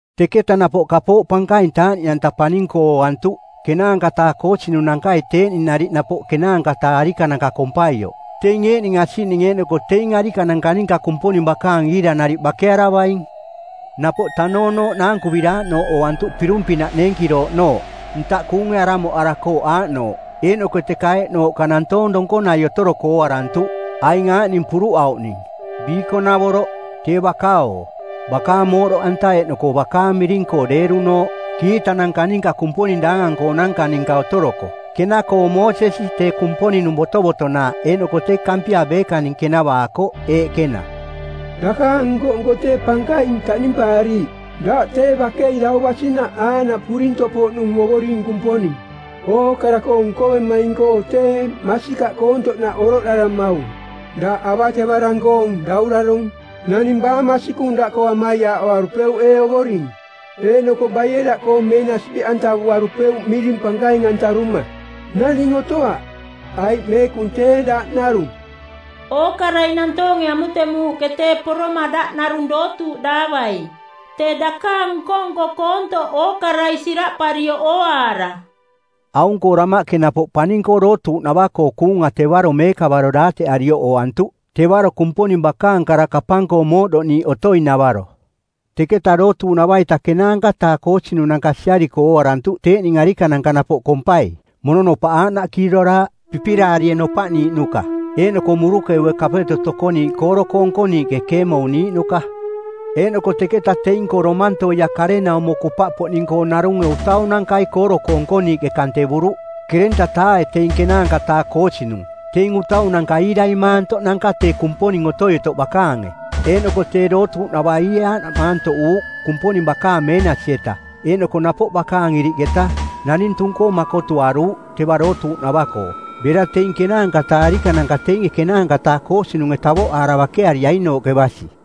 Teketa napoꞌ kapooꞌ pankaing taaꞌniꞌanta paning-koo ooantuꞌ ˜kenaanka-taa koosinunankai teeꞌning nariꞌ napoꞌ ˜kenaanka-taa arikananka kompaioꞌ. Teing eeꞌning asiꞌning eeꞌnoko teing arikananka ninka Kumponing bakaang iira nariꞌ bakearavaing. Napoꞌ tanoonooꞌ naankuviraaꞌnooꞌ ooantuꞌ pirung-pinaꞌ neenkirooꞌnooꞌ, ntaꞌ kuunge aramoꞌarakooꞌ aaꞌnooꞌ. Eeꞌnoko teka eeꞌnooꞌka nantoong donkonai otoroko ooarantuꞌ, aing aaꞌning puruꞌauꞌning: biikonavoroꞌ, tee baka-oo, bakaang mooꞌdoꞌanta eeꞌnoko bakaang miring-koo deerunooꞌ; kiitananka ninka Kumponing daangang-koonanka ninka otoroko. Kena-koo Moosesi, tee Kumponing-nung botovotonaaꞌ, eeꞌnoko tee Kampia beekaning kenavaakoꞌ, eeꞌ kena: “Dakaang nko-nko tee pankaing taꞌnimpaariiꞌ. Daꞌ tee bakei dau basinaꞌ aaꞌnaꞌ purintoꞌpoꞌnung Ovoring Kumponing, Ookara-koo nkovemaing-koo tee masikaꞌ koontoꞌnaꞌ oroꞌdaramaung. Daꞌ avatevarang-koong daurarong˜. Naning baa masikung daꞌkoo amaiaaꞌoarupeuꞌ ee Ovoring? Eeꞌnoko baie daꞌkoo meenasi beꞌantavuarupeuꞌ miring pankaing-antaruma? Naning otoaꞌ, aiꞌ meekung tee daꞌ narung. Ookarai nantoonge amutemuuꞌke tee poroma daꞌ narung dootuuꞌdaavaing, tee dakaang nko-nko koontoꞌ ookarai siraꞌparioꞌ ooaara.” Aung-koo damaꞌke napoꞌ paning-koo dootuuꞌnava-koo kuunga tevaro meekavaro daateꞌarioꞌ ooantuꞌ, tevaro Kumponing bakaang kara kapang-koo mooꞌdoꞌniiꞌ otoing-navaro. Teketa dootuuꞌnava-ita ˜kenaanka-taa koosinunanka siariko ooarantuꞌ teeꞌning arikananka napoꞌ kompai. Mononopaꞌ aaꞌnaꞌ kiiroraaꞌ, pipiraarie nopaꞌniiꞌnuka eeꞌnoko murukeue kapeto tokoniiꞌ kooro-koo nkoniiꞌke keemouniiꞌnuka. Eeꞌnoko teketa teing-koo domantoia karenaumo kupaꞌpoꞌning-koo narunge utaunankai kooro-koo nkoniiꞌke kantevuruꞌ ˜kerenta-taae teing ˜kenaanka-taa koosinung, teing utaunanka iirai maantoꞌnanka tee Kumponing Otoi-otoꞌ bakaange. Eeꞌnoko tee dootuuꞌnava iie aaꞌnaꞌ maantoꞌuuꞌ Kumponing bakaang meenasi-eta eeꞌnoko napoꞌ bakaang iriꞌketa, naning tung-koo makotuaruuꞌ teva dootuuꞌnava-koo, bera teing ˜kenaanka-taa arikananka teinge ˜kenaanka-taa koosinunge tavoꞌaara bakeariainooꞌke basi.